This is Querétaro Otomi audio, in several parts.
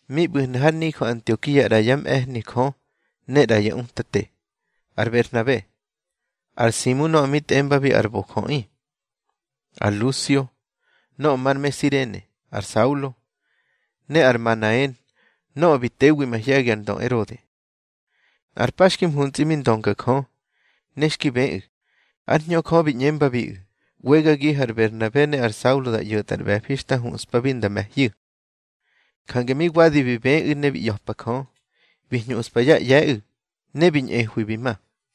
Mi ꞌbu̱hnu̱ har nijö Antiokia ꞌra yá mꞌe̱hni Jö ne ꞌra ya utate: Ar Berhnabe, ar Simu nöꞌö mi tꞌembabi ar ꞌBojöꞌi, ar Lusio nöꞌö mar me Sirene, ar Saulo, ne ar Manaen nöꞌö bi tewi mahye̱gi ar ndö Erode. Nꞌar pa xki mhuntsꞌi mi ndönga Jö, ne xki bëꞌu̱. Ár Hñö Jö bi ꞌñembabiꞌu̱: —ꞌWegagihu̱ ar Berhnabe ne ar Saulo da ꞌyo̱tꞌa ar ꞌbe̱fi xta huꞌspabi nda me̱hyu̱. Jange mi wadi bi bëꞌu̱ ne bi ꞌya̱pa Jö, bi hñuꞌspa yá ꞌye̱ꞌu̱, ne bi ñꞌehwi bi ma.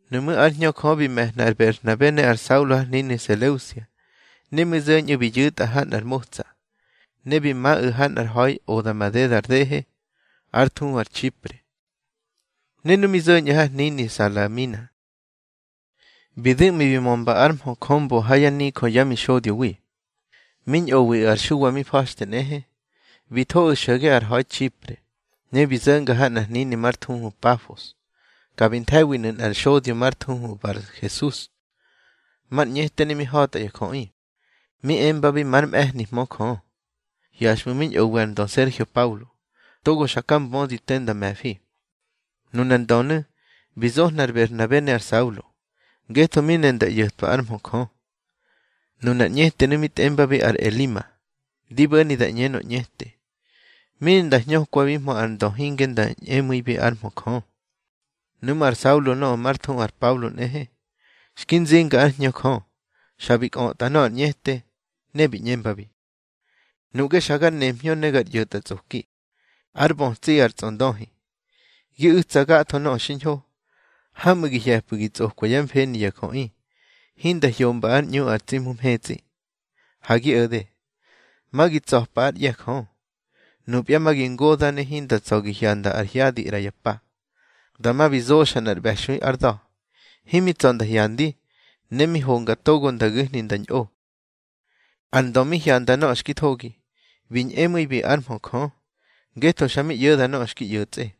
Nuꞌmú̱ ár Hñö Jö bi me̱hna ar Berhnabe ne ar Saulo har hnini Seleusia. Ne mi zo̱nu̱ bi yu̱tꞌa ha nꞌar motsa, ne bi maꞌu̱ ha nꞌar ha̱i oda madeda ar dehe, ár thuhu ar Txipre. Ne nu mi zo̱ñꞌu̱ har hnini Salamina, bi du̱ꞌmi bi mömba ár mhö Jö mbo ha yá nijö yá mixodyowi. Mi ñꞌowiꞌu̱ ar Xuwa mi fa̱xte nꞌehe. Bi thoꞌu̱ xo̱ge ar ha̱i Txipre, ne bi zo̱nga ha nꞌar hnini már thuhu Pafos. Ka bi nthe̱winu̱ nꞌar xodyo már thuhu Barhesus, mar ñꞌete ne mi ha̱tya jöꞌi, mi embabi már mꞌe̱hnihmö Jö. Hyaxꞌmu̱ mi ñꞌowi ar ndö Sergio Paulo togo xaka mbödi te da me̱fi. Nunar ndönu̱ bi zohna ar Berhnabe ne ar Saulo, ngetho mi ne nda ꞌyo̱twa ár mhö Jö. Nunar ñꞌetenu̱ mi tꞌembabi ar Elima (di bo̱ni da ꞌñenö ꞌñete), mi ne nda hñökwahmö ar ndö hinge nda ñꞌemu̱ibi ár mhö Jö. Nuꞌmú̱ ar Saulo nöꞌö már thuhu ar Pablo nꞌehe, xki nzimba ár Hñö Jö, xa bi kꞌötꞌa nöꞌö ar ñꞌete. Ne bi ꞌñembabi: —Nuꞌge xa gar nemhñö ne gar ꞌyo̱tꞌatsꞌoki, ár bötsiꞌi ar tsꞌondöhi, gi u̱tsa gatho nöꞌö xiñho. Hamꞌu̱ gi hye̱pꞌu̱ gi tsꞌokwa yá mfeni ya jöꞌi hinda hyomba ár ꞌñu ar tsi Hmu mhetsꞌi. Ha gi o̱de, ma gi tsa̱pa ár ꞌye̱ Jö. Nupya ma gi ngoda̱ ne hinda tsa̱ gi hyanda ar hyadi ꞌra ya pa. Dama bi zoxa nꞌar ꞌbe̱xui ár da̱. Himi tsa̱ nda hyandi, ne mi honga togo nda gu̱hni nda ñꞌo. Ar ndö mi hyanda nöꞌö xki thogi, bi ñꞌemu̱ibi ár mhö Jö, ngetho xa bi ꞌyo̱da nöꞌö xki ꞌyo̱tsꞌe.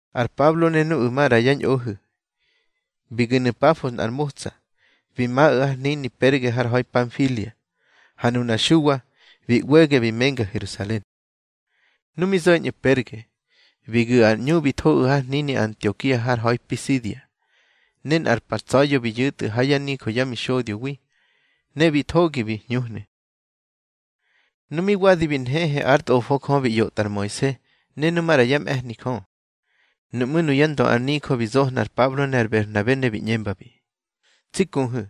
Ar Pablo ne nuꞌu̱ maꞌra yá ñꞌohu̱, bi gu̱nu̱ Pafos nꞌar motsa, bi maꞌu̱ har hnini Perge har ha̱i Panfilia. Ha nunar Xuwa bi ꞌwege bi menga Herusalen. Nu mi zo̱ñꞌu̱ Perge, bi gu̱ ar ꞌñu bi thoꞌu̱ har hnini Antiokia har ha̱i Pisidia. Ne nꞌar pa ntsa̱ya̱ bi yu̱tꞌu̱ ha yá nijö yá mixodyowi, ne bi thogi bi hñuhnu̱. Nu mi wadi bi nhehe ár tꞌofo Jö bi ꞌyotꞌa ar Moise ne nu maꞌra yá mꞌe̱hni Jö, nuꞌmú̱ nuyá ndö ar nijö bi zohna ar Pablo ne ar Berhnabe, ne bi ꞌñembabi: —Tsi kuhu̱,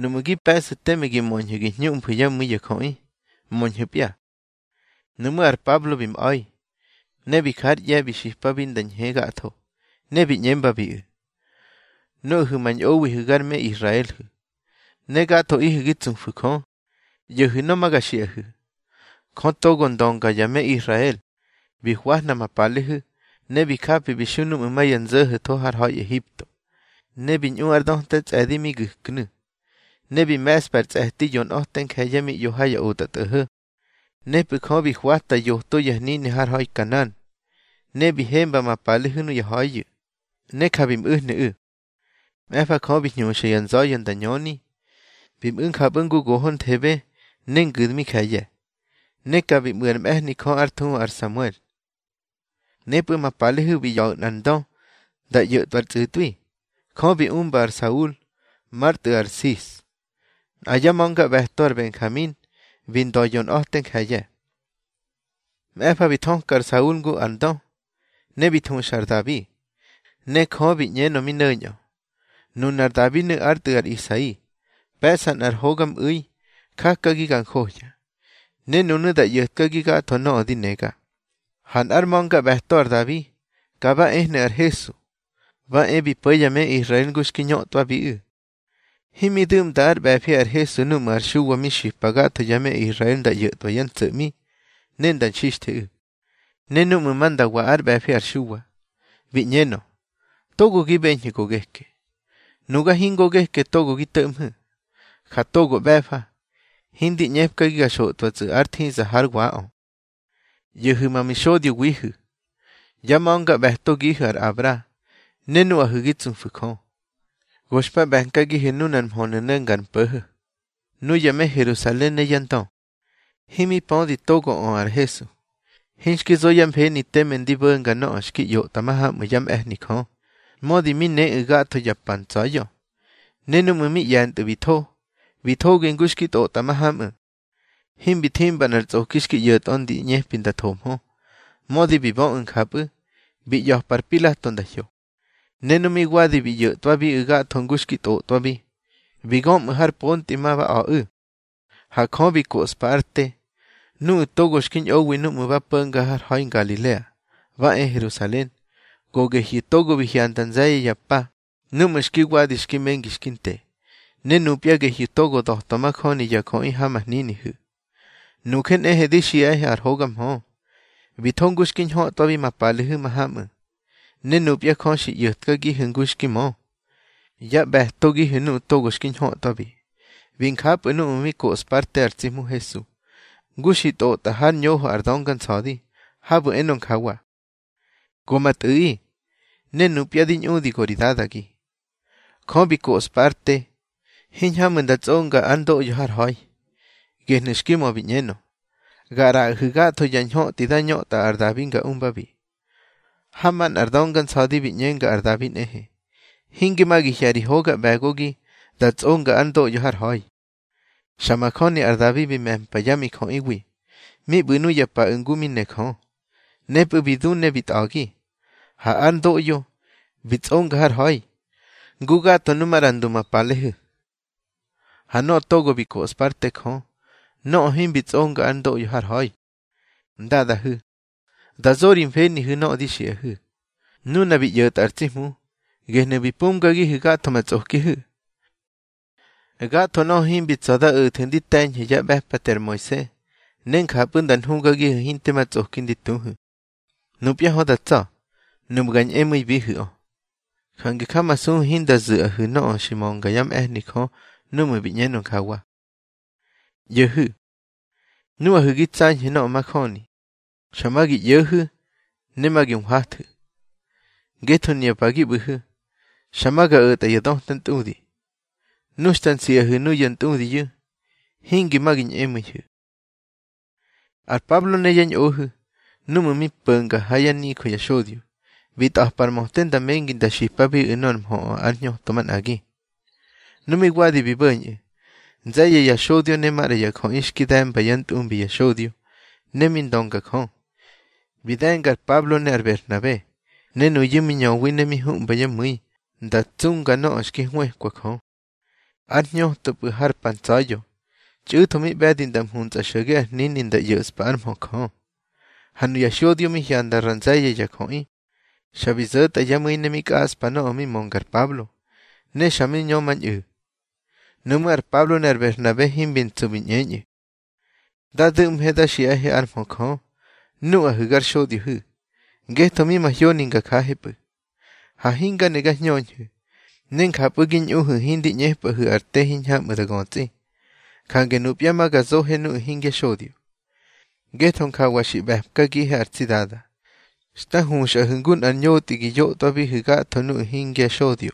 nuꞌmu̱ gi pe̱ꞌsu̱ teme gi möñhu̱ gi hñuꞌmfu̱ yá mu̱i ya jöꞌi, möñhu̱pya. Nuꞌmú̱ ar Pablo bi mꞌa̱i, ne bi jár ꞌye̱ bi xipabi nda ñhe gatho, ne bi ꞌñembabiꞌu̱: —Nuꞌahu̱ ma ñꞌowihu̱ gar me Israelhu̱, ne gathoꞌihu̱ gi tsufu̱ Jö, ꞌyo̱hu̱ nöꞌö ma ga xiꞌahu̱: Jö togo ndönga ya me Israel bi hwahna ma palehu̱, ne bi japi bi xu núꞌmu̱ ma ya nzo̱ho̱tho har ha̱i Ehipto, ne bi ñꞌu ár döta tsꞌe̱di mi gu̱knu̱. Ne bi me̱ꞌspa ar tsꞌe̱ti yonꞌa̱te nje̱ye̱ mi ꞌyo ha ya otꞌatꞌo̱ho̱. Nepꞌu̱ Jö bi hwata yoto ya hnini har ha̱i Kanan, ne bi hemba ma palehu̱ nuya ha̱iyu̱, ne ja bi mꞌu̱hnu̱ꞌu̱. Mꞌe̱fa Jö bi hñuxa ya nza̱ya̱ nda ñöni. Bi mꞌu̱ njapꞌu̱ ngu gohonthebe ne ngu̱dmi nje̱ye̱, ne ka bi mꞌu̱ ár mꞌe̱hni Jö ár thuhu ar Samuel. Nepꞌu̱ ma palehu̱ bi ꞌya̱ꞌu̱ nꞌar ndö nda ꞌyo̱tꞌwa ar tsꞌu̱tꞌwi. Jö bi umba ar Saul már tꞌu̱ ar Sis, nꞌa yá ma̱ngaꞌbe̱to ar Benjamin, bi ndö yonꞌa̱te nje̱ye̱. Mꞌe̱fa bi thöka ar Saul ngu ar ndö, ne bi thuxa ar Dabi. Ne Jö bi ꞌñenö mi no̱ñꞌö: Nunar Dabinu̱ ár tꞌu̱ ar Isai, pe̱ꞌsa nꞌar hogamꞌu̱i jakagi ga njohya, ne nunu̱ da ꞌyo̱tkagi gatho nöꞌö di nega. Ha nꞌár ma̱ngaꞌbe̱to ar Dabi, ka ba ehnu̱ ar Hesu, ba e bi po̱ ya me Israel ngu xki ñötꞌwabiꞌu̱. Himi du̱ꞌmda ár ꞌbe̱fi ar Hesu núꞌmu̱ ar Xuwa mi xipa gatho ya me Israel nda ꞌyo̱tꞌwa yá ntso̱ꞌmi, ne nda nxixtheꞌu̱. Ne núꞌmu̱ ma nda wa ár ꞌbe̱fi ar Xuwa, bi ꞌñenö: Togo gi beñhu̱ go geke. Nuga hingo geke togo gi to̱ꞌmhu̱. Ja togo ꞌbe̱fa, hindi ꞌñepkagi ga xotꞌwatsꞌu̱ ár thiza hár waꞌö. ꞌYo̱hu̱ ma mixodyowihu̱, yá ma̱ngaꞌbe̱togihu̱ ar Abra, ne nuꞌahu̱ gi tsufu̱ Jö, go xpa ꞌbe̱nkagihu̱ nunar mhönu̱ no̱nga ar mpo̱ho̱. Nuya me Herusalen ne yá ndö, himi pödi togoꞌö ar Hesu. Hinxki zo yá mfeni teme ndi bo̱nga nöꞌö xki ꞌyotꞌa mahamꞌu̱ yá mꞌe̱hni Jö, mödi mi neꞌu̱ gatho ya pa ntsa̱ya̱. Ne núꞌmu̱ mi ꞌye̱ntꞌu̱ bi tho, bi thogi ngu xki tꞌotꞌa mahamꞌu̱. Himbi thimba nꞌar tsꞌoki xki ꞌyo̱tꞌö ndi ꞌñepi nda thomhö. Mödi bi böꞌu̱ njapꞌu̱, bi ꞌya̱pa ar Pilato nda hyo. Ne nu mi wadi bi ꞌyo̱tꞌwabiꞌu̱ gatho ngu xki tꞌotꞌwabi, bi gömꞌu̱ har pontꞌi ma ba a̱ꞌu̱. Ha Jö bi koꞌspa ár te. Nuꞌu̱ togo xki ñꞌowi núꞌmu̱ ba po̱nga har ha̱i Ngalilea ba e Herusalen, go gehyu̱ togo bi hyanda nze̱ye̱ ya pa núꞌmu̱ xki wadi xki mengi xki nte. Ne nupya gehyu̱ togo da̱twa majöni ya jöꞌi ha ma hninihu̱. Nuje nꞌehe di xiꞌahe ar hoga mhö, bi tho ngu xki ñhötꞌwabi ma palehu̱ mahamꞌu̱. Ne nupya Jö xi ꞌyo̱tkagihu̱ ngu xki mö, yá ꞌbe̱togihu̱ nuꞌu̱ togo xki ñhötwabi. Bi njapꞌu̱ núꞌmu̱ mi koꞌspa ár te ar tsi Hmu Hesu, ngu xi tꞌotꞌa hár ñoho ar Dönga Nsa̱di, habu̱ enö njawa: Go ma tꞌu̱ꞌi, ne nupya di ñꞌudi go ri Dadagi. Jö bi koꞌspa ár te, hiñhamꞌu̱ nda tsꞌonga ár ndoꞌyo har ha̱i. Gehnu̱ xki mö bi ꞌñenö: Ga ꞌraꞌahu̱ gatho ya ñhöꞌti da ñötꞌa ar Dabi nga umbabi. Ha manꞌar Dönga Nsa̱di bi ꞌñenga ar Dabi nꞌehe: Hinge ma gi hye̱ ri hoga ꞌbe̱gogi da tsꞌonga ár ndoꞌyo har ha̱i. Xa majöni ar Dabi bi me̱mpa yá mijöꞌiwi mi ꞌbu̱ nuya paꞌu̱ ngu mi ne Jö. Nepꞌu̱ bi du ne bi tꞌa̱gi, ha ár ndoꞌyo bi tsꞌonga har ha̱i, ngu gatho nu maꞌra ndu ma palehu̱. Ha nöꞌö togo bi koꞌspa ár te Jö, nöꞌö himbi tsꞌonga ár ndoꞌyo har ha̱i. Ndadahu̱, dá zo ri mfenihu̱ nöꞌö di xiꞌahu̱: Nuna bi ꞌyo̱tꞌa ar tsi Hmu, gehnu̱ bi pumgagihu̱ gatho ma tsꞌokihu̱. Gatho nöꞌö himbi tsa̱ da o̱thu̱ ndi te̱ñhu̱ yá ꞌbe̱pate ar Moise, ne njapꞌu̱ nda nhugagihu̱ hinte ma tsꞌoki ndi tuhu̱, nupya hö da tsa̱, nuꞌmu̱ ga ñꞌemu̱ibihu̱ꞌö. Jange jamasuhu̱ hinda zu̱ꞌahu̱ nöꞌö xi mönga yá mꞌe̱hni Jö núꞌmu̱ bi ꞌñenö njawa: ꞌYo̱hu̱, nuꞌahu̱ gi tsañhu̱ nöꞌö majöni, xa ma gi ꞌyo̱hu̱ ne ma gi nhwathu̱. Ngetho nuya pa gi ꞌbu̱hu̱, xa ma ga o̱tꞌa ya döta ntꞌudi. Nu xta nsiꞌahu̱ nuya ntꞌudiyu̱, hingi ma gi ñꞌemu̱ihu̱. Ar Pablo ne yá ñꞌohu̱, núꞌmu̱ mi po̱nga ha yá nijö ya xodyo, bi tꞌa̱pa ar möte nda mengi nda xipabiꞌu̱ nor mhöꞌö ár hñöto manꞌagi. Ne mi wadi bi bo̱ñꞌu̱, nze̱ye̱ ya xodyo ne maꞌra ya jöꞌi xki de̱mba yá ntꞌumbi ya xodyo ne mi ndönga Jö, bi de̱nga ar Pablo ne ar Berhnabe. Ne nuyu̱ mi ñöwi ne mi huꞌmba yá mu̱i nda tsunga nöꞌö xki hwëkwa Jö. Ar hñötopꞌu̱ har pa ntsa̱ya̱, txꞌu̱tho mi ꞌbe̱di nda mhunsa xo̱ge ar hnini nda ꞌyo̱ꞌspa ár mhö Jö. Ha nuya xodyo mi hyanda ra nze̱ye̱ ya jöꞌi, xa bi zo̱tꞌa yá mu̱i ne mi kꞌaꞌspa nöꞌö mi mönga ar Pablo, ne xa mi ñömañꞌu̱. Nuꞌmú̱ ar Pablo ne ar Berhnabe himbi ntsu bi ꞌñeñꞌu̱: —Da du̱ꞌmhe da xiꞌahe ár mhö Jö, nuꞌahu̱ gar xodyohu̱, ngetho mi mahyoni nga jahepꞌu̱. Ha hinga ne ga hñöñhu̱, ne njapꞌu̱ gi ñꞌuhu̱ hindi ꞌñepꞌahu̱ ar te hiñhamꞌu̱ da götsꞌi. Jange nupya ma ga zohe nuꞌu̱ hingya xodyo. Ngetho njawa xi ꞌbe̱mkagihe ar tsi Dada: Xta huxꞌahu̱ ngu nꞌar ñotꞌi gi yotꞌwahu̱ gatho nuꞌu̱ hingya xodyo,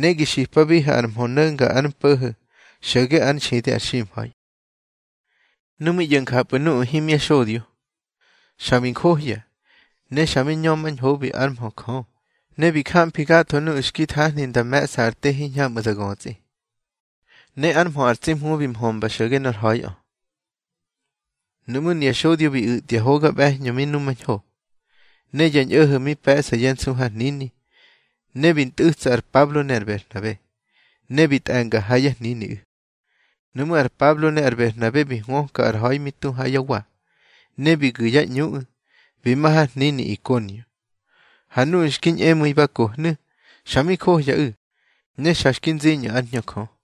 ne gi xipabihu̱ ar mhö no̱nga ar mpo̱ho̱ xo̱ge ár nxidi ar ximha̱i. Nu mi ꞌyo̱ njapꞌu̱ nuꞌu̱ himya xodyo, xa bi njohya, ne xa mi ñömañhobi ár mhö Jö. Ne bi jamfi gatho nuꞌu̱ xki thahni nda me̱ꞌsa ar te hiñhamꞌu̱ da götsꞌi. Ne ár mhö ar tsi Hmu bi mhömba xo̱ge nor ha̱iꞌö. Nuꞌmú̱ nuya xodyo bi u̱tya hoga ꞌbe̱hñö mi nhumañho, ne ya ñꞌo̱ho̱ mi pe̱ꞌsa yá nsu har hnini, ne bi ntꞌu̱tsa ar Pablo ne ar Berhnabe, ne bi tꞌe̱nga ha yá hniniꞌu̱. Nuꞌmú̱ ar Pablo ne ar Berhnabe bi hwöka ar ha̱i mi tu ha yá wa, ne bi gu̱ yá ꞌñuꞌu̱ bi ma har hnini Ikonio. Ha nuꞌu̱ xki ñꞌemu̱i ba kohnu̱, xa mi johyaꞌu̱, ne xa xki nziñꞌu̱ ár Hñö Jö.